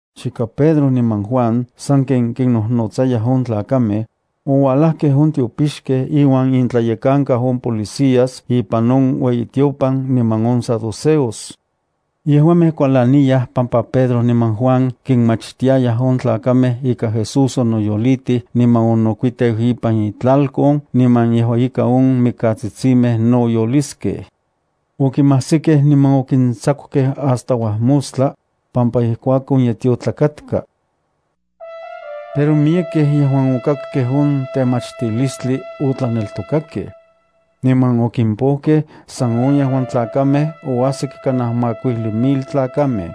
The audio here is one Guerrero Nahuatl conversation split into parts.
Chika Pedro niman Juan sanken kinnojnotsayaj on tlakamej, oualajkej on tiopixkej iuan intlayekankau on policías ipan on ueyitiopan niman on saduceos. Yejuamej kualaniyaj pampa Pedro niman Juan kinmachtiayaj on tlakamej ika Jesús onoyolitij niman onokuiteu ipan itlalkon niman yejua ika on mikatsitsimej no yoliskej. Okimajsikej niman okintsakukej hasta uajmostla, pampa ijkuakon ye tiotlak katka. Pero miyekej yejuan okakkej on temachtilistli otlaneltokakej. Niman okimpojkej san on yejuan tlakamej oajsik kanaj makuijli mil tlakamej.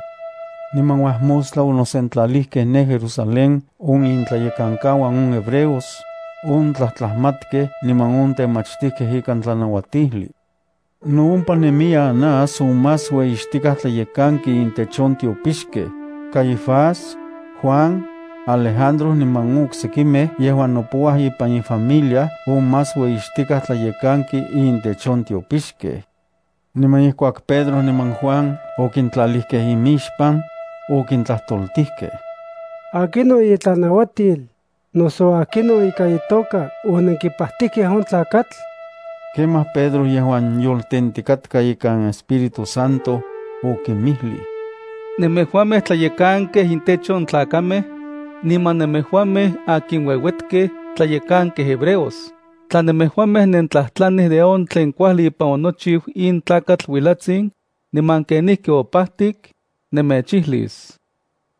Niman uajmostla onosentlalijkej ne Jerusalén on intlayekankauan on hebreos, on tlajtlajmatkej niman on temachtijkej ikan tlanauatijli. No ompa nemiya Anás on más ueyixtikaj tlayekanki intech on tiopixkej, Caifás, Juan, Alejandro niman on oksekimej yejuan nopouaj ipan ifamilia on más ueyixtikaj tlayekanki intech on tiopixkej. Niman ijkuak Pedro niman Juan okintlalijkej imixpan, okintlajtoltijkej: —¿Akinon itlanauatil, noso akinon ika itoka onenkipajtijkej on tlakatl? Kemaj Pedro yejuan yoltentikatka ikan Espíritu Santo, okinmijlij: —Nemejuamej tlayekankej intech on tlakamej, niman nemejuamej akin ueuetkej tlayekankej hebreos, tla nemejuamej nentlajtlanij de on tlen kuajli ipan onochiu in tlakatl uilatsin, niman kenijki opajtik, nemechijlis.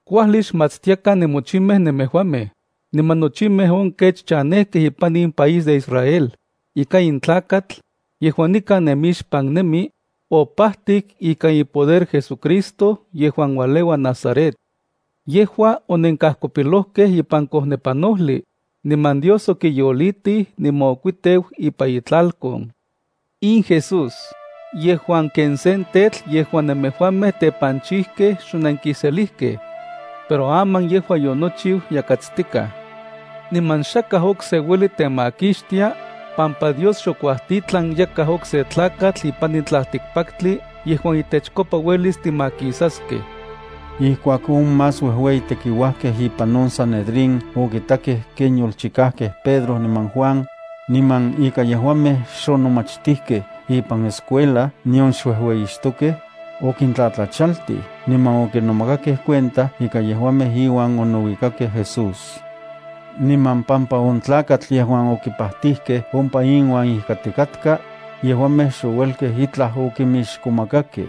Kuajli xmatstiakan nemochimej nemejuamej, niman nochimej on kech chanejkej ipan in país de Israel, ika in tlakatl, yejuan nikan nemixpan nemi, opajtik ikan ipoder JesuCristo yejuan ualeua Nazaret. Yejua onenkajkopilojkej ipan kojnepanojli, niman Dios okiyolitij niman okuiteu ipan itlalkon. In Jesús, yejuan ken sen tetl yejuan nemejuamej tepanchijkej xonenkiselijkej. Pero aman yejua yonochiu yakatstikaj. Niman xakaj okse ueli temakixtia, pampa Dios xokuajtitlan yakaj okse tlakatl ipan in tlaltikpaktli yejuan itechkopa uelis timakisaskej. Ijkuak on más uejueyitekiuajkej ipan on Sanedrín okitakej ken yolchikajkej Pedro niman Juan, niman ika yejuamej xonomachtijkej ipan escuela nion xuejueyixtokej, okintlatlachaltij niman okinomakakej cuenta ika yejuamej iuan onouikakej Jesús. Niman pampa on tlakatl yejuan okipajtijkej ompa inuan ijkatikatka, yejuamej xouelkej itlaj okimixkomakakej.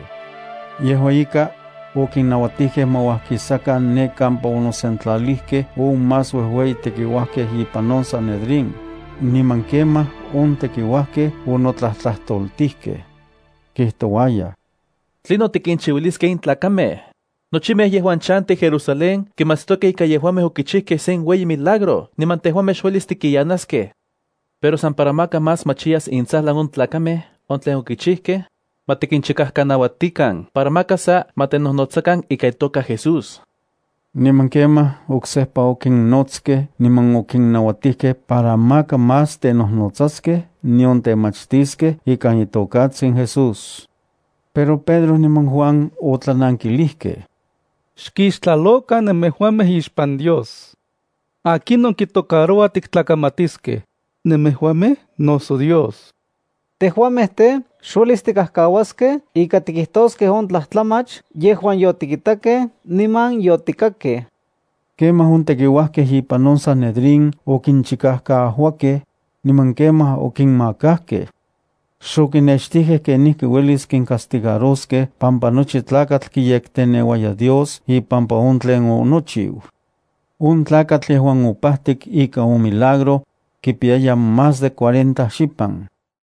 Yejua ika, okinnauatijkej ma uajkisakan ne kampa onosentlalijkej on más uejueyitekiuajkej ipan on Sanedrín, niman kemaj on tekiuajkej onotlajtlajtoltijkej. Kijtouayaj: —¿Tlinon tikinchiuiliskej in tlakamej? Nochimej yejuan chantij Jerusalén kimatstokej ika yejuamej okichijkej sen ueyi milagro niman tejuamej xuelis tikiyanaskej. Pero san para maka más machiyas intsajlan on tlakamej on tlen okichijkej, ma tikinchikajkanauatikan para maka sa ma tenojnotsakan ikan itoka Jesús. Niman kemaj oksejpa okinnotskej niman okinnauatijkej para maka más tenojnotsaskej nion temachtiskej ikan itokatsin Jesús. Pero Pedro niman Juan otlanankilijkej: —Xkixtlalokan nemejuamej ixpan Dios. ¿Akinon kitocarouaj tiktlakamatiskej, nemejuamej noso Dios? Tejuamej tej, xuelis tikajkauaskej ika tikijtoskej on tlajtlamach yejuan yotikitakej niman yotikakej. Kemaj on tekiuajkej ipan on Sanedrín okinchikajkaajuakej, niman kemaj okinmakajkej. Xokinextijkej kenijki uelis kincastigaroskej pampa nochi tlakatl kiyekteneuaya Dios ipampa on tlen onochiu. On tlakatl, yejuan opajtik ikan on milagro, kipiyaya más de cuarenta xipan.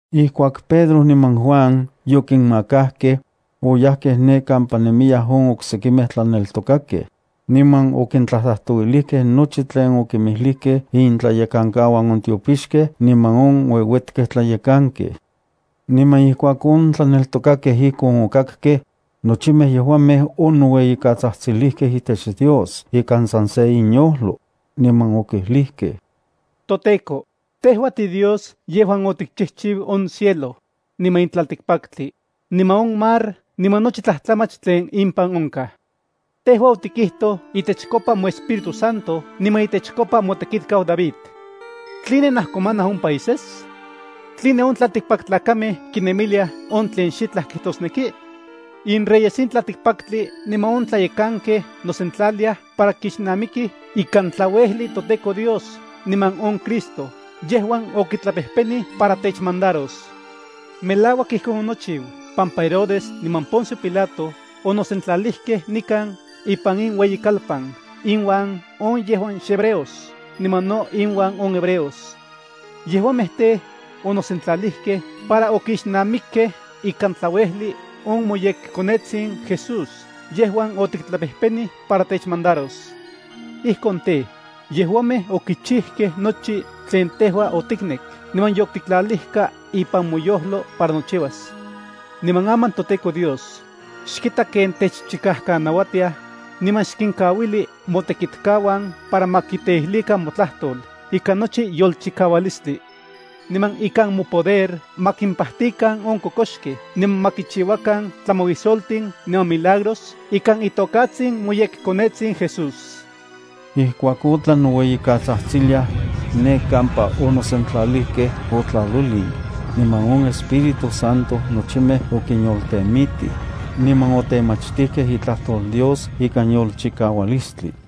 Ijkuak Pedro niman Juan yokinmakajkej, oyajkej ne kampa nemiyaj on oksekimej tlaneltokakej, niman okintlajtlajtouilijkej nochi tlen okimilijkej intlayekankauan on tiopixkej niman on ueuetkej tlayekankej. Niman ijkuak on tlaneltokakej ijkon okakkej, nochimej yejuamej onoueyikatsajtsilijkej itech Dios ikan san se inyojlo, niman okijlijkej: —ToTEKO, tejua tiDios yejuan otikchijchiu on cielo, niman in tlaltikpaktli, niman on mar niman nochi tlajtlamach tlen impan onkaj. Tejua otikijtoj itechkopa moEspíritu Santo niman itechkopa motekitkau David: ¿Tline najkomanaj on países? ¿Tline on tlaltikpaktlakamej kinemiliaj on tlen xitlaj kijtosneki? Inreyes in tlaltikpaktli niman on tlayekankej nosentlaliaj para kixnamikij ikan tlauejli toTEKO Dios niman on Cristo yejuan okitlapejpenij para techmandaros. ’Melauak ijkon onochiu pampa Herodes niman Poncio Pilato onosentlalijkej nikan ipan in ueyikalpan inuan on yejuan xhebreos niman no inuan on hebreos. Yejuamej tej, onosentlalijkej para okixnamikkej ikan tlauejli on moyekKonetsin Jesús yejuan otiktlapejpenij para techmandaros. Ijkon tej, yejuamej okichijkej nochi tlen tejua otiknek niman yotiktlalijkaj ipan moyojlo para nochiuas. Niman aman toTEKO Dios, xkita ken techchikajkanauatiaj, niman xkinkauili motekitkauan para ma kiteijlijkan motlajtol ikan nochi yolchikaualistli. Niman ikan mopoder ma kimpajtikan on kokoxkej niman ma kichiuakan tlamauisoltin niman milagros ikan itokatsin moyekKonetsin Jesús. Ijkuak otlan noueyikatsajtsiliaj, ne kampa onosentlalijkej otlalolin, niman on Espíritu Santo nochimej okinyoltemitij, niman otemachtijkej itlajtol Dios ikan yolchikaualistli.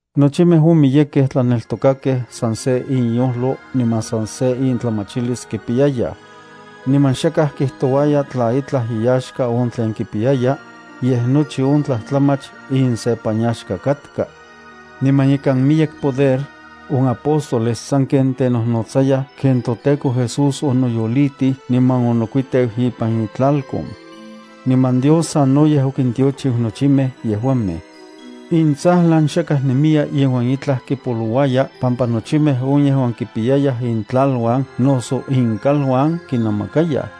Nochimej on miyekej tlaneltokakej san se inyojlo niman san se intlamachilis kipiyayaj. Niman xakaj kijtouaya tla itlaj iyaxka on tlen kipiyaya, yej nochi on tlajtlamach insepanyaxka katka. Niman ikan miyek poder, on apóstoles sanken tenojnotsayaj ken toTEKO Jesús onoyolitij niman onokuiteu ipan itlalkon. Niman Dios sanoyej okintiochiu nochimej yejuamej. Intsajlan xakaj nemiya yejuan itlaj kipolouaya pampa nochimej on yejuan kipiyayaj intlaluan noso inkaluan kinnamakayaj,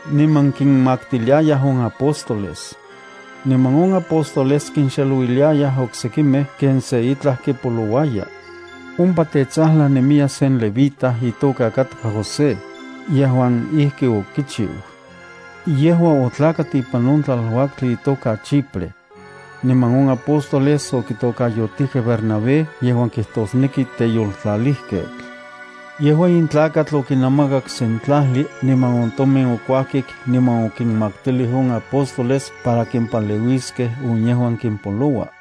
niman kinmaktiliayaj on apóstoles. Niman on apóstoles kinxelouiliayaj oksekimej ken se itlaj kipolouaya. Ompa tetsajlan nemiya sen levita, itoka katka José, yejuan ijki okichiu. Yejua otlakat ipan on tlaluaktli itoka Chipre. Niman on apóstoles okitokayotijkej Bernabé yejuan kijtosneki teyoltlalijketl. Yejua in tlakatl okinamakak sen tlajli niman on tomin okuajkik niman okinmaktilij on apóstoles para kimpaleuiskej on yejuan kimpoloua.